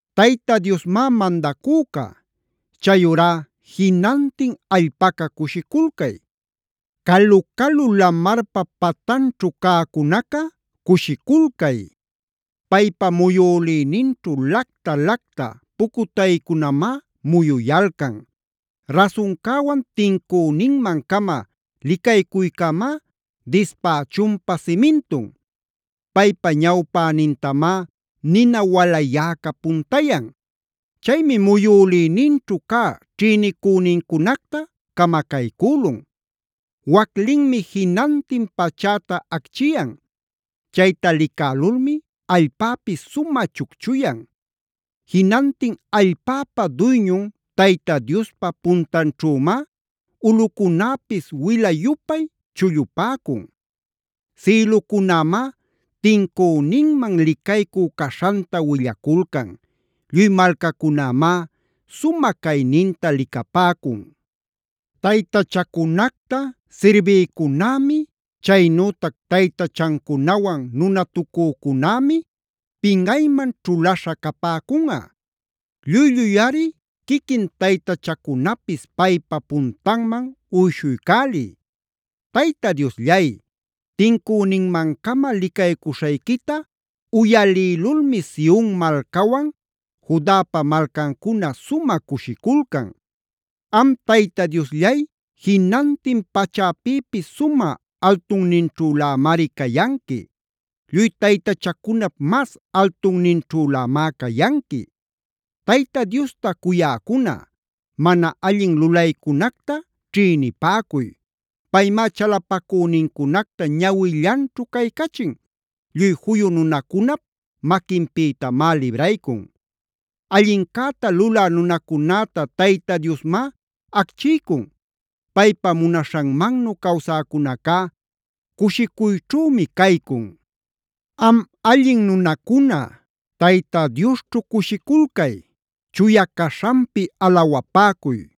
¡Tayta Diosmá mandacüca! Chayurá ¡jinantin allpaca cushiculcay! ¡Calu-calu lamarpa patanćhu cäcunaca cushiculcay! Paypa muyülïninćhu lacta-lacta pucutaycunamá muyuyalcan. Rasuncäwan, tincüninman-cama licaycuycämá dispächunpa simintun. Paypa ñawpänintamá nina walayäca puntayan. Chaymi muyülïninćhu cä ćhïnicünincunacta camacaycülun. Waclinmi jinantin pachäta acchiyan. Chayta licälulmi allpäpis sumä chucchuyan. Jinantin allpäpa duyñun Tayta Diospa puntanćhümáa ulꞌucunäpis wila-yupay chullupäcun. Sïlucunämá tincüninman licaycu caśhanta willaculcan. Lluy malcacunämá sumä cayninta licapäcun. Taytachacunacta sirbïcunämi, chaynütac taytachancunawan nunatucücunämi pinꞌayman ćhulaśha capäcunꞌa. Lluy-lluyꞌari, quiquin taytachacunapis paypa puntanman uyshuycäliy. Tayta Diosllay, tincüninmancama licaycuśhayquita uyalïlulmi Sion malcawan Judapa malcancuna sumä cushiculcan. Am Tayta Diosllay jinantin pachäpïpis sumä altunninćhülämari cayanqui. Lluy taytachacunap mas altunninćhülämá cayanqui. Tayta Diosta cuyäcuna, mana allin lulaycunacta ćhïnipäcuy. Paymá chalapacünincunacta ñawillanćhu caycachin, lluy juyu nunacunap maquinpïtamá libraycun. Allincäta lulä nunacunäta Tayta Diosmá acchiycun. Paypa munaśhanmannu cawsäcunacá cushicuyćhümi caycun. ¡Am allin nunacuna, Tayta Diosćhu cushiculcay! ¡Chuya caśhanpi alawapäcuy!